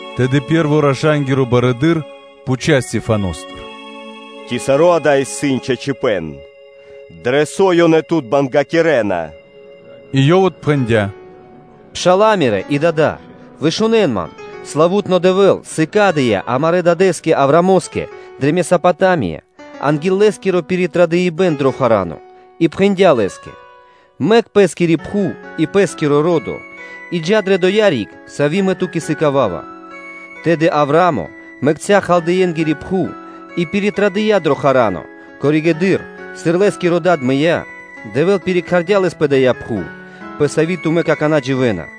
Тэды пэ́рво раша́нгиро барыдыро́ пхуця́ Стехваностыр: “Ци саро́ дава́ исын чачипэ́н, дрэ со ёнэ тут бангякирэна?” И ёв отпхэндя́: “Пшала́лэ мирэ́, дадолэ! Вышунэн ман. Славу́тно Дэвэ́л сыкадыя́ амарэ́ дадэ́скэ Авраамо́скэ дрэ Месопатамия анги́л лэ́скиро пиритрадыпэн дро Харано, и пхэндя́ лэ́скэ: ‘Мэк пэ́скири пхув и пэ́скиро ро́до, и джа́ дрэ доя́ риг, сави́ Мэ ту́кэ сыкава́ва’. Тэды Авраа́мо мэкця́ Халдеенгири пхув и пиритрадыя дро Харано; коригэды́р, сыр лэ́скиро дад мыя́, Дэвэ́л пирикхардя лэс пэ дая́ пхув, пэ сави́ тумэ́ какана́ дживэ́на.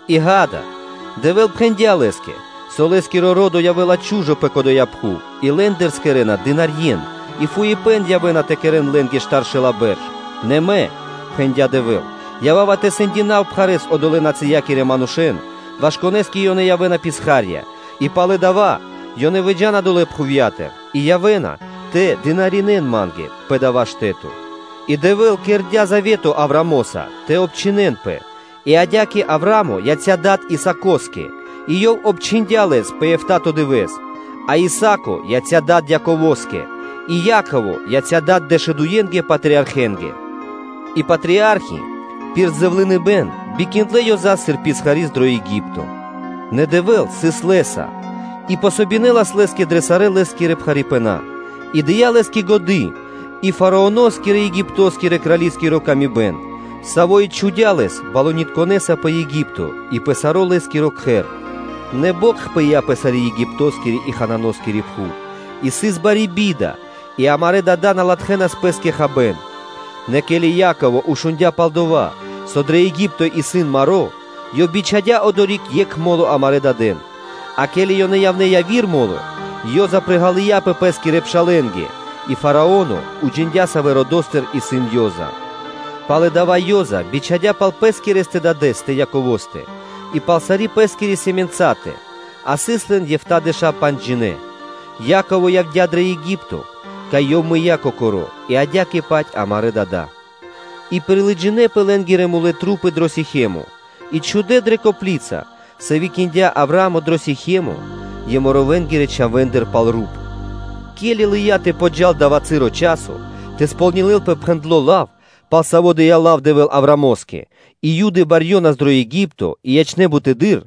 И ґа́да, Дэвэ́л пхэндя́ лэ́скэ: ‘Со лэ́скирэ-чхавэ́нгиро ро́до явэ́ла чу́жо пэ кодоя пхув и лэ́ндыр скэрэна писхарье́н и явэ́на тэ притасавэн штаршэла́ бэрш; нэ Мэ, – пхэндя́ Дэвэ́л, – ява́ва тэ сэндякирав пхарэ́с одолэ́ – нацыякирэ манушэ́н, ваш конэ́скэ ёнэ явэ́на писха́рья; и палэ дава́ ёнэ выджа́на долэ́ пхувья́тыр и явэ́на тэ дынаринэ́н Ма́нгэ пэ дава́ штэ́то. И Дэвэ́л кэрдя́ Завето Авраамоса тэ обчхинэнпэ; и адя́кэ Авраа́мо яця́ дадэ́са Исаако́скэ и ёв обчхиндя лэс пэ эфта́то дывэ́с; а Исаа́ко яця́ дадэ́са Яково́скэ, и Яково яця́ дадэ́са дэшудуенгэ патриархэнгэ. И патриархи пир зэвлыныпэ́н бикиндлэ Ёзас сыр писхари́с дро Еги́пто; нэ Дэвэ́л сыс лэ́са, и помогинэлас лэ́скэ дрэ сарэ́ лэ́скирэ пхарипэна, и дыя́ лэ́скэ годы́ и Фараоно́скирэ-Египто́скирэ крали́скири паты́в, саво́ и чхудя́ лэс балунитконэса пэ Еги́пто и пэ саро́ лэ́скиро кхэр. Нэ бокх пыя́ пэ сари́ Египто́скири и Ханаано́скири пхув, и сыс бари би́да; и амарэ́ дада́ на латхэнас пэ́скэ хабэ́н. Нэ ке́ли Яково шундя́ пал дова́, со дрэ Еги́пто исын маро́, ёв бичхадя́ одори́к екх мо́ло амарэ́ дадэн; а ке́ли ёнэ явнэ́ яви́р мо́ло, Ёза (Иосифо) приґалыяпэ пэ́скирэ пшалэ́нгэ, и Фарао́но уджиндя́, савэ́ родо́стыр сыс Ёза. Пало́ дава́ Ёза бичхадя́ пал пэскирэстэ дадэ́стэ Яковостэ и пал сари́ пэ́скири сэмэнцатэ, а сыс лэн эфтадэша́ панджджинэ. Яково явдя́ дрэ Еги́пто, кай ёв мыя́ кокоро́ и адя́кэ-паць амарэ́ дада́; и пирилыджинэ лэ́нгирэ тру́пы дро Сихемо и чхудэ́ дрэ копли́ца, сави́ киндя Авраа́мо дро Сихемо Еморэнгирэ чхавэ́ндыр пал руп. Ке́ли лыя́ тэ подджа́л дава́ часо тэ кэрэ́лпэ пхэндло́ лав, пал саво́ дыя́ лав Дэвэ́л Авраамо́скэ, и Юды барьёнас дро Еги́пто и ячнэ́ бутыдыр,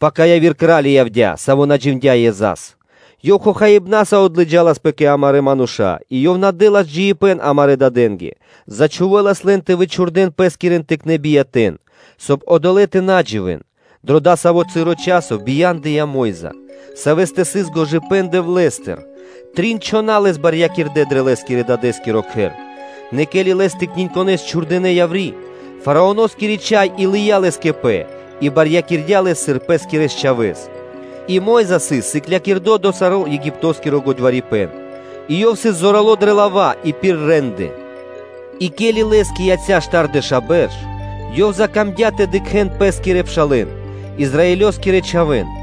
пака яви́р кра́ли явдя́, саво́ на джиндя́ Ёзас. Ёв хохаибнаса отлыджаласпэ кэ амарэ́ мануша́ и ёв на дэ́лас джиибэ́н амарэ́ дадэ́нгэ; ёв зачхувэлас лэн тэ вычхурдэн пэскирэн тыкнэ́ биятэ́н, соб (кай) одолэ́ тэ на дживэ́н. Дро дасаво часо бия́ндыя о Мо́йза (Моисеё), савэ́стэ сыс шукарипэ́н Дэвлэ́стыр, трин чхона́ лэс барьякирдэ́ дрэ лэ́скирэ-дадэ́скиро кхэр. Нэ ке́ли лэс тыкниньконэс чхурдынэ́ яври́, Фараоноскири чхай и лыя́ лэс кэ пэ и барьякирдя лэс, сыр пэ́скирэс чхавэ́с. И Мо́йза сыс сыклякирдо дро саро́ Египто́скиро годьварипэн, и ёв сыс зорало́ дрэ лава́ и пир рэ́нды. И ке́ли лэ́скэ яця́ штардэша́ бэрш, ёв закамдя́ тэ дыкхэ́н пэ́скирэ пшалэ́н, Израилёскирэ чхавэ́н;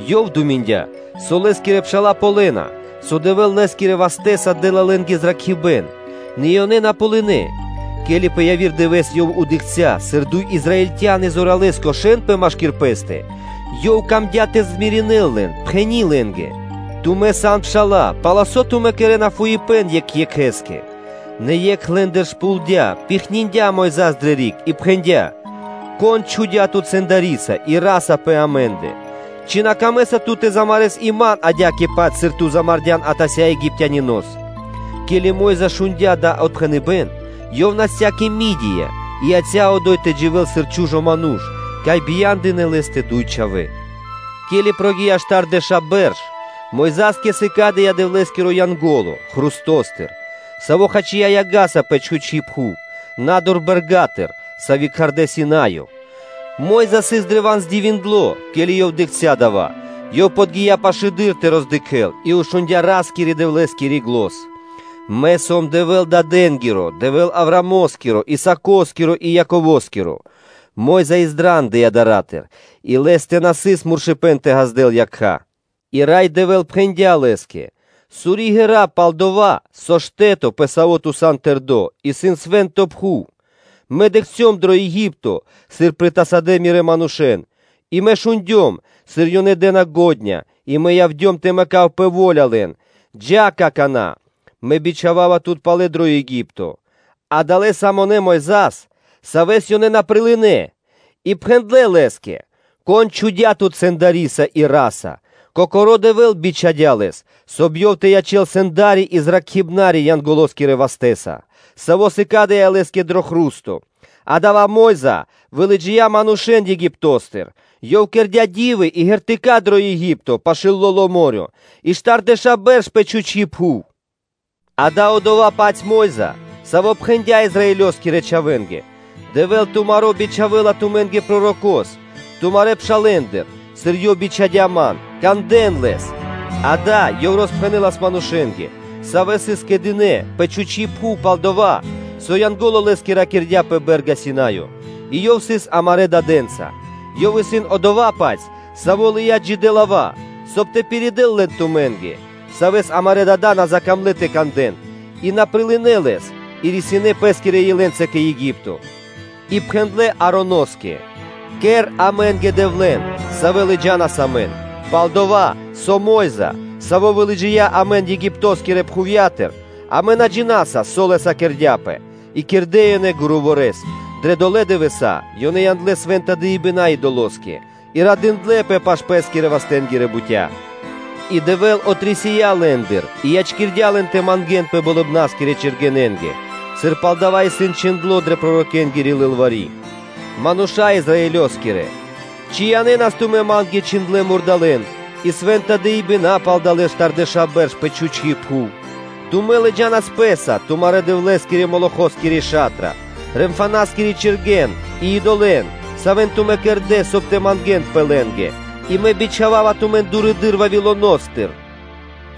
Ёв думиндя, со лэ́скирэ пша́ла ґалёна, со Дэвэ́л лэ́скирэ вастэ́са дэ́ла лэ́нгэ зракхибэ́н; нэ ёнэ на ґалынэ́. Ке́ли пэ яви́р дывэ́с ёв дыкхця́, сыр дуй Израильтя́ни чингардэпэ машки́р пэ́стэ, ёв камдя́ тэ раманякирэ́л (змиринэл) лэн, пхэни́ лэ́нгэ: “Тумэ́ сан пша́ла, палсо́ тумэ́ кэрэ́на фуипэ́н екх екхэ́скэ? Нэ екх лэ́ндыр шпулдя (пихниндя) Мойза́с дрэ риг и пхэндя́: “Кон чхудя́ тут сэндариса и ра́са пэ амэ́ндэ?” Ци на камэ́са ту тэ замарэс и ман адя́кэ-паць, сыр ту замардян атася́ Египтянинос?” Ке́ли Мо́йза шундя́ дава́ отпхэныбэ́н, ёв насця кэ Мидия, и яця́ одо́й тэ дживэ́л сыр чу́жо ману́ш, кай бия́ндынэ лэ́стэ дуй чхавэ́. Ке́ли прогия́ (накхця́) штардэша́ бэрш, Мойза́скэ сыкадыя́ Дэвлэ́скиро Янго́ло хрустостыр, саво́ хачия яга́са пэ чхучи́ пхув, на́дур бэрга́тыр, сави́ кхардэ́ “Синаё.” Мо́йза сыс древа́н дивиндло, ке́ли ёв дыкхця́ дава́, Ёв подги́я пашылэды́р тэ роздыкхэл, и шундя́ Ра́скирэ-Дэвлэ́скири зан: “Мэ сом Дэвэ́л тырэ́ дадэ́нгиро, Дэвэ́л Авраамо́скиро, Исаакоскиро и Яково́скиро.” Мо́йза издрандыя дара́тыр и лэ́стэ на сыс муршыпэн тэ ґаздэл якха́. И Рай Дэвэ́л пхэндя́ лэ́скэ: “Сури ґэра́, пал-дова́ со штэ́то, пэ саво́ ту сан тэрдо́, исын свэ́нто пхув. Мэ дыкхцём дро Еги́пто, сыр притасадэ Мирэ́ манушэ́н и Мэ шундём, сыр ёнэ пхарэ́с дэ́на ґондя́ и Мэ явдём тэ мэкав пэ во́ля лэн: джа́, какана́, Мэ бичхава́ва тут палэ дро Еги́пто.” Адалэ́ самонэ Мойза́с, савэ́с ёнэ на прилынэ́ и пхэндлэ́ лэ́скэ: “Кон чхудя́ тут сэндариса и ра́са?” Кокоро́ Дэвэ́л бичхадя́ лэс, соб (кай) ёв тэ ячэ́л сэндариса и выракхибнариса Янголоскирэ вастэ́са, саво́ сыкадыя́ лэ́скэ дро хру́сто. Адава́ Мо́йза вылыджия́ манушэ́н Египто́стыр, ёв кэрдя́ ди́вы и ґертыка́ дро Еги́пто пашы́л Лоло́ мо́рё (дэрья́в), и штардэша́ бэрш пэ чхучи́ пхув. Ѓа́да, одова́-паць Мо́йза, саво́ пхэндя́ Израилёскирэ чхавэ́нгэ: “Дэвэ́л тумаро́ бичхавэ́ла тумэ́нгэ Пророко́с, тумарэ́ пшалэ́ндыр, сыр Ёв бичхадя́ ман; кандэ́н Лэс.” Акэ, ёв роспхэнэлас манушэ́нгэ, савэ́ сыс кэдынэ пэ чхучи́ пхув пал дова́, со Янго́ло лэ́скэ ракирдя́ пэ бэ́рга Синаё, и ёв сыс амарэ́ дадэ́нца; ёв исын одова́-паць, саво́ лыя́ джидэ́ лава́, соб (кай) тэ пиридэл лэн тумэ́нгэ; Савэс амарэ́ дада́ на закамлэ тэ кандэ́н, и на прилынэ́ лэс, а рисинэ́ пэ́скирэ илэнца кэ Еги́пто, и пхэндлэ́ Ароноскэ: “Кэр амэ́нгэ дэвлэн, савэ́ лыджа́нас амэн, пал-дова́ со Мо́йза, саво́ вылыджия́ амэн Египто́скирэ пхувья́тыр, амэ на джина́са, со лэ́са кэрдя́пэ.” И кэрдэ́ ёнэ гуруво́рэс дрэ долэ́ дывэса́, ёнэ яндлэ́ свэ́нта дыибэна́ идолоскэ, и радындлэпэ пашы́л пэ́скирэ-вастэнгирэ бутя́. И Дэвэ́л отрисия лэ́ндыр и ячкирдя́ лэн тэ мангэ́нпэ болыбна́скирэ чэргэненгэ, сыр пал дава́ исын чхиндло́ дрэ пророкэнгири лылвари́: “Мануша́лэ Израилёскирэ! Ци янэ́нас тумэ́ ма́нгэ чхиндлэ́ мурдалэ́н и свэ́нта дыибэна́ пал далэ́ штардэша́ бэрш пэ чхучи́ пхув. Тумэ́ лыджа́нас пэ́са тумарэ́ – дэвлэскири Молохоскири ша́тра, Ремфаноскири чэргэн и и́долы, савэ́н тумэ́ кэрдэ́, соб (кай) тэ мангэ́нпэ лэ́нгэ; и Мэ бичхава́ва тумэн дурэды́р Вавилоно́стыр.”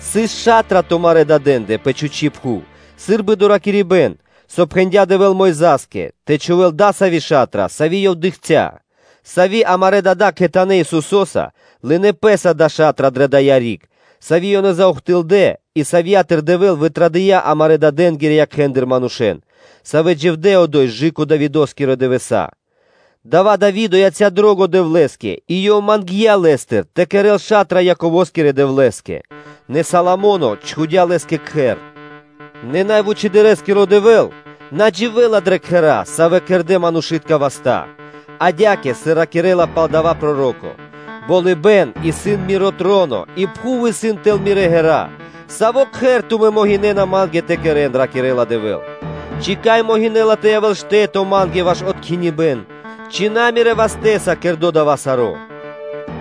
Дая́ ша́тра сыс тумарэ́ дадэндэ пэ чхучи́ пхув сы́рбы доракирибэ́н, со пхэндя́ Дэвэ́л Мойза́скэ, тэ чхувэ́л дасави́ ша́тра, сави́ ёв дыкхця́; сави́ амарэ́ дада́ кхэтанэ́ Исусо́са (Ёхошуаса) лынэ́ Пэ́са ша́тра дрэ дая́ риг, сави́ ёнэ заухтылдэ и савья́тыр Дэвэ́л вытрадыя́ амарэ́ дадэнги́рэ якхэ́ндыр манушэ́н, савэ́ дживдэ́ одо́й кэ Давидо́скирэ дывэса́; адава́ Дави́до яця́ дро́го Дэвлэ́скэ и ёв мангдя́ Лэ́стыр тэ кэрэ́л ша́тра Яково́скирэ Дэвлэ́скэ; нэ Соломо́но чхудя́ Лэ́скэ Кхэр. Нэ Са́мо Вучэды́р Дэвэ́л на дживэ́ла дрэ кхэра́, савэ́ кэрдэ́ манушы́тка васта́, адя́кэ, сыр ракирэ́ла пал дава́ проро́ко: “Болыбэ́н исын Миро троно, и пхув исын тэл Мирэ́ ґэра́: саво́ кхэр тумэ́ могинэ́на Ма́нгэ тэ кэрэ́н? – ракирэ́ла Дэвэ́л, – ци кай могинэ́ла тэ явэ́л штэ́то Ма́нгэ ваш откхиныбэн? Ци на Мирэ́ вастэ́са кэрдо́ дава́ саро́?”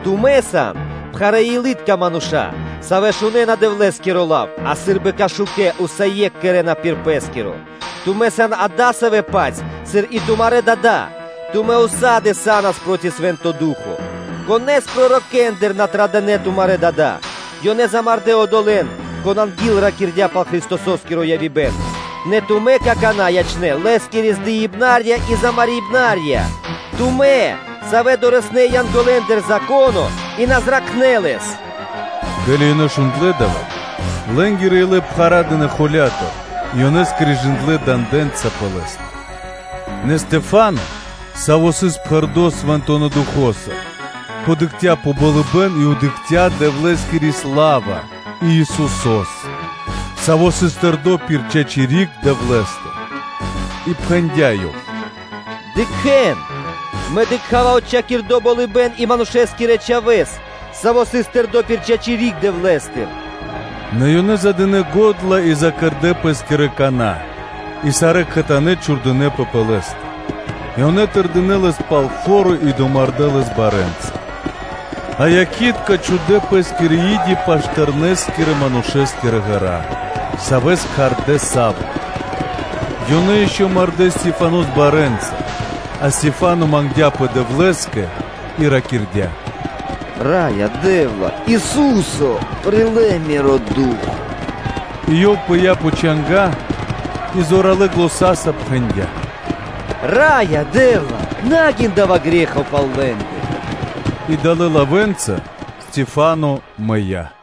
Тумэ́ сан пхарэ́-илытка мануша́, савэ́ шунэ́на Дэвлэ́скиро лав, а сы́рбы кашукэ усае́кх кэрэ́на пир пэ́скиро! Тумэ́ сан адасавэ́-паць, сыр и тумарэ́ дада́, тумэ́ ўса́ды (сак) (усегда) са́нас проти Свэ́нто Ду́хо (Фа́но). Конэ́с пророкэндыр на традынэ тумарэ́ дада́? Ёнэ замардэ́ (умардэ) одолэ́н, кон анги́л ракирдя́ пал Христосо́скиро явибэн, нэ тумэ́ какана́ ячнэ́ Лэ́скирэ здыибнарья и замарибнарья! Тумэ́, савэ́ дорэснэ́ (лынэ́) янголэндыр Зако́но, и савэ́ на зракхнэ́ лэс.” Ке́ли ёнэ шундлэ́ дава́, лэ́нгирэ илэ пхарадынэ холя́тыр и ёнэ скрежындлэ дандэнца пэ лэ́стэ. Нэ Стехвано, саво́ сыс пхэрдо́ Свэнтонэ́ Духо́са, дыкхця упрэ́ пэ болыбэ́н и дыкхця́ Дэвлэ́скири сла́ва и Исусо́с, саво́ сыс тэрдо́ пир чачи́ риг Дэвлэ́стыр, И пхэндя́ ёв: “Дыкхэ́н! Мэ дыкха́ва отчхакирдо болыбэ́н и Манушэ́скирэ Чхавэ́с, Саво́ сыс тэрдо́ пир чачи́ риг Дэвлэ́стыр.” Нэ ёнэ задынэ го́дла и закэрдэ пэ́скирэ кана́, и сарэ́ кхэтанэ́ чхурдынэпэ пэ лэ́стэ; и ёнэ тырдынэ лэс пал фо́ро и домардэ́ лэс барэ́нца. А якхи́тка чхудэ́ пэ́скирэ и́ди пашы́л тэрнэ́-манушэ́скирэ ґэра́, савэ́с кхардэ́ Савло. Ёнэ ишчо (инкэ́) мардэ́ Стехванос барэ́нца, а Стехвано мангдя́пэ Дэвлэ́скэ и ракирдя́: “Раё Дэ́вла, Ису́се! Прилэ́ миро ду́хо (фа́но).” И ёв пыя́ пэ чанга́ и зоралэ́ заня́са пхэндя́: “Раё Дэ́вла! На гин дава́ грэ́хо пал лэ́ндэ.” И далэ́ лавэ́нца Стехвано мыя́.